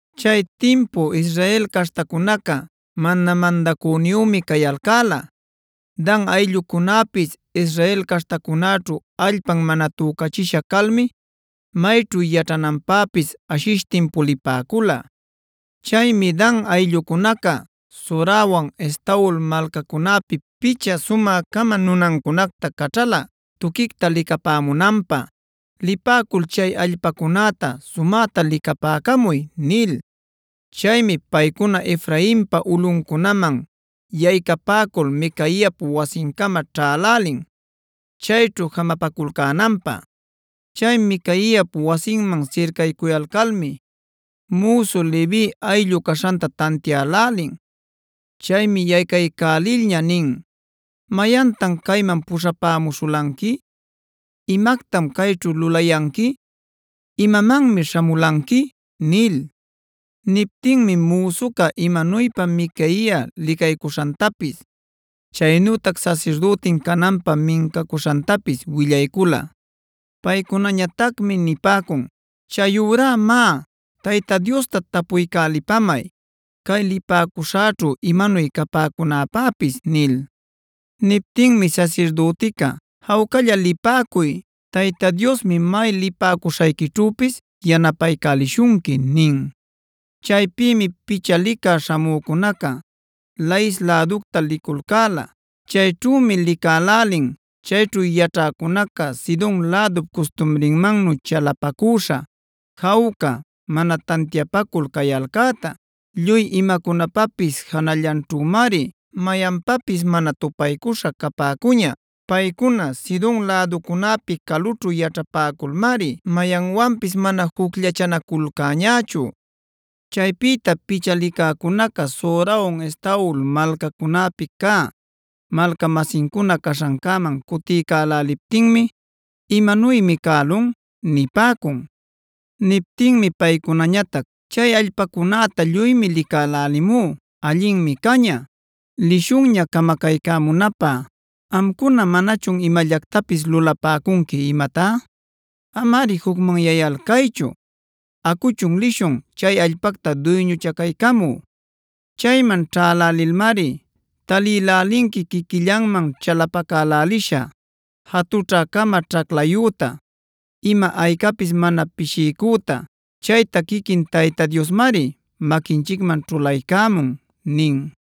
Chay timpu Israel caśhtacunaca mana mandacüniyümi cayalcäla. Dan ayllucunäpisa Israel caśhtacunäćhu allpan mana tücachisha calmi mayćhu yaćhananpäpis ashishtin pulipäcula. Chaymi Dan ayllucunaca Zorawan Estaol malcacunäpi picha sumä-cama nunancunacta caćhala, tuquicta licapämunanpä: “Lipäcul chay allpacunäta sumäta licapäcamuy” nil. Chaymi paycuna Efrainpa ulꞌuncunaman yaycapäcul Micaiap wasincama ćhälälin chayćhu jamapaculcänanpä. Chay Micaiap wasinman sircaycuyalcalmi müsu Levi ayllu caśhanta tantiälälin. Chaymi yaycaycälilña nin: “¿Mayantan cayman puśhämuśhulanqui? ¿Imactam cayćhu lulayanqui? ¿Imamanmi śhamulanqui?” nil. Niptinmi müsuca imanuypa Micaia licaycuśhantapis, chaynutac sasirdütin cananpä mincacuśhantapis willaycula. Paycunañatacmi nipäcun: “Chayurá má, Tayta Diosta tapuycälipamay cay lipäcuśhäćhu imanuy capäcunäpäpis” nil. Niptinmi sasirdütica: “Jawcalla lipäcuy. Tayta Diosmi may lipäcuśhayquićhüpis yanapaycälishunqui” nin. Chaypïmi picha licä śhamücunaca Lais läducta liculcäla. Chayćhümi licälälin chayćhu yaćhäcunaca Sidon lädup custumrinmannu chalapacüśha, jawca, mana tantiapacul cayalcäta. Lluy imacunapapis janallanćhümari, mayanpapis mana tupaycuśha capäcuña. Paycuna Sidon läducunäpi calućhu yaćhapäculmari mayanwanpis mana jucllachanaculcäñächu. Chaypïta picha licäcunaca Zorawan Estaol malcacunäpi cä malca-masincuna caśhancäman cutiycäläliptinmi: “¿Imanuymi cälun?” nipäcun. Niptinmi paycunañatac: “Chay allpacunäta lluymi licälälimú. Allinmi caña. ¡Lishunña camacaycämunapä! ¿Amcuna manachun imallactapis lulapäcunqui imatá? Amari jucmanyayalcaychu; acuchunb lishun chay allpacta duyñuchacaycamü. Chayman ćhälälilmari talïlälinqui quiquillanman chalapacälälisha, jatućhä-cama ćhaclayüta, ima aycapis mana pishiycüta. Chayta quiquin Tayta Diosmari maquinchicman ćhulaycämun” nin.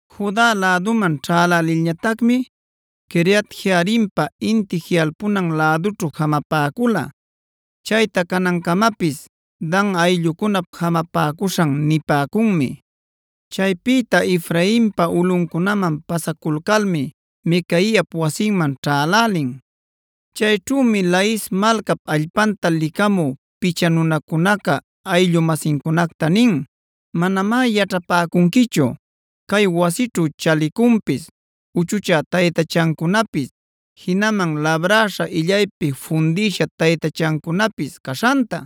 Juda läduman ćhälälilñatacmi Quiriat-jearimpa inti jiꞌalpunan lädućhu jamapäcula. Chayta canancamapis “Dan ayllucunap jamapäcuśhan” nipäcunmi. Chaypïta Efrainpa ulꞌuncunaman pasaculcalmi Micaiap wasinman ćhälälin. Chayćhümi Lais malcap allpanta licamü picha nunacunaca ayllu-masincunacta nin: “Manamá yaćhapäcunquichu cay wasićhu chalicunpis, uchuchä taytachancunapis, jinaman labräśha illaypi fundïsha taytachancunapis caśhanta.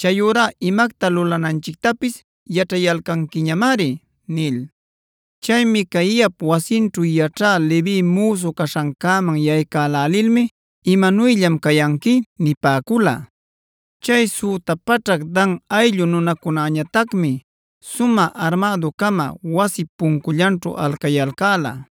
Chayurá imacta lulananchictapis yaćhayalcanquiñamari” nil. Chay Micaiap wasinćhu yaćhä Levi müsu caśhancäman yaycälälilmi: “¿Imanuyllam cayanqui?” nipäcula. Chay süta paćhac Dan ayllu nunacunäñatacmi sumä armädu-cama wasip puncullanćhu alcayalcäla.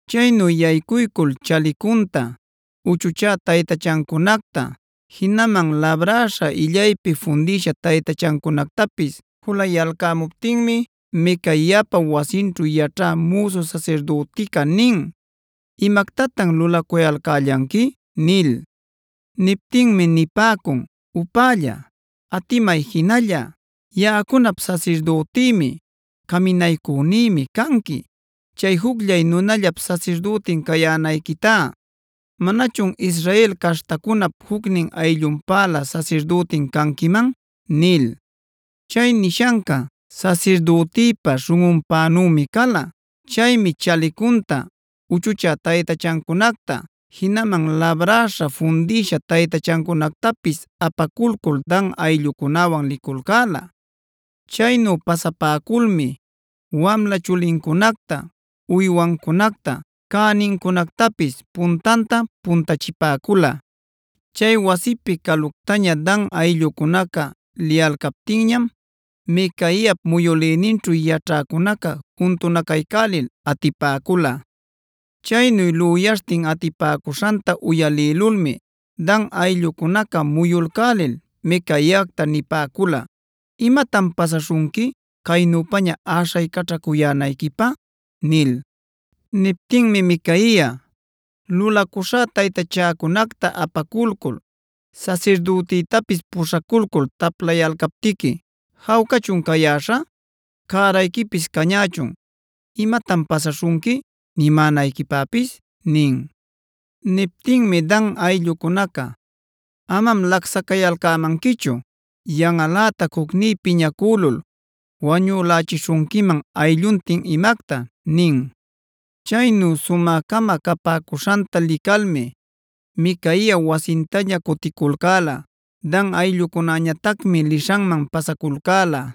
Chaynu yaycuycul chalicunta, uchuchä taytachancunacta, jinaman labräśha illaypi fundïsha taytachancunactapis julayalcämuptinmi Micaiapa wasinćhu yaćhä müsu sasirdütica nin: “¿Imactatan lulacuyalcällanqui?” nil. Niptinmi nipäcun: “Upälla, atimay jinalla. Yaꞌacunap sasirdütïmi, caminaycünïmi canqui. ¿Chay jucllay nunallap sasirdütin cayänayquitá, manachun Israel caśhtacunap jucnin ayllunpälä sasirdütin canquiman?” nil. Chay nishanca sasirdütïpa śhunꞌunpänümi cala. Chaymi chalicunta, uchuchä taytachancunacta, jinaman labräśha fundïsha taytachancunactapis apaculcul Dan ayllucunäwan liculcäla. Chaynu pasapäculmi wamla chulincunacta, uywancunacta, cänincunactapis puntanta puntachipäcula. Chay wasipi caluctaña Dan ayllucunaca liyalcaptinñam Micaiap muyülïninćhu yaćhäcunaca juntunacaycälil atipäcula. Chaynu lüyaśhtin atipäcuśhanta uyalïlulmi Dan ayllucunaca muyulcälil Micaiacta nipäcula: “¿Imatan pasaśhunqui, caynüpaña äśhaycaćhacuyänayquipä?” nil. Niptinmi Micaia: “Lulacuśhá taytachäcunacta apaculcul, sasirdütïtapis puśhaculcul taplayalcaptiqui ¿jawcachun cayäśha? Cärayquipis cañächun ‘¿imatan pasäśhunqui?’ nimänayquipäpis” nin. Niptinmi Dan ayllucunaca: “Amam lacsacayalcämanquichu; yanꞌalätac jucní piñacülul wañülächishunquiman aylluntin imacta” nin. Chaynu sumä-cama capäcuśhanta licalmi Micaia wasintaña cuticulcäla. Dan ayllucunäñatacmi lishanman pasaculcäla.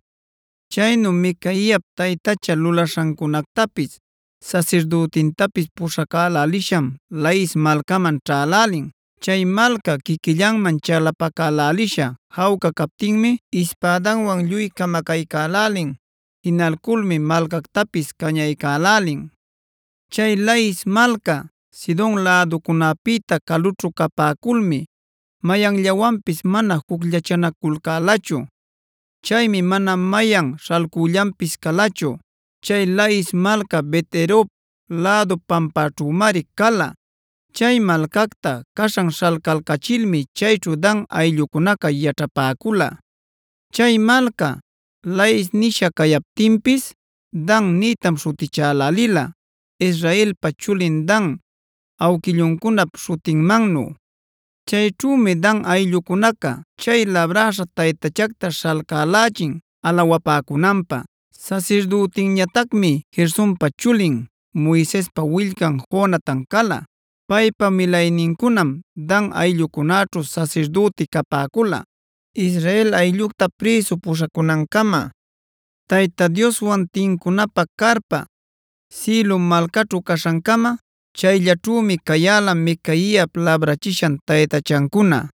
Chaynu Micaiap taytacha lulaśhancunactapis, sasirdütintapis puśhacälälisham Lais malcaman ćhälälin. Chay malca quiquillanman chalapacälälisha jawca captinmi ispädanwan lluy camacaycälälin; jinalculmi malcactapis cañaycälälin. Chay Lais malca Sidon läducunäpïta calućhu capäculmi mayanllawanpis mana jucllachanaculcälachu. Chaymi mana mayan śhalcüllanpis calachu. Chay Lais malca Bet-rehob lädu pampaćhümari cala. Chay malcacta caśhan śhalcalcachilmi chayćhu Dan ayllucunaca yaćhapäcula. Chay malca “Lais” nisha cayaptinpis “Dan” nïtam śhutichälälila Israelpa chulin Dan awquilluncunap śhutinmannu. Chayćhümi Dan ayllucunaca chay labräśha taytachacta śhalcälächin alawapäcunanpä. Sasirdütinñatacmi Gersonpa chulin, Moisespa willcan Jonatan cala. Paypa milaynincunam Dan ayllucunäćhu sasirdüti capäcula, Israel ayllucta prïsu puśhacunancama. Tayta Dioswan tincunapä carpa, Silo malcaćhu caśhancama chayllaćhümi cayäla Micaiap labrachishan taytachancuna.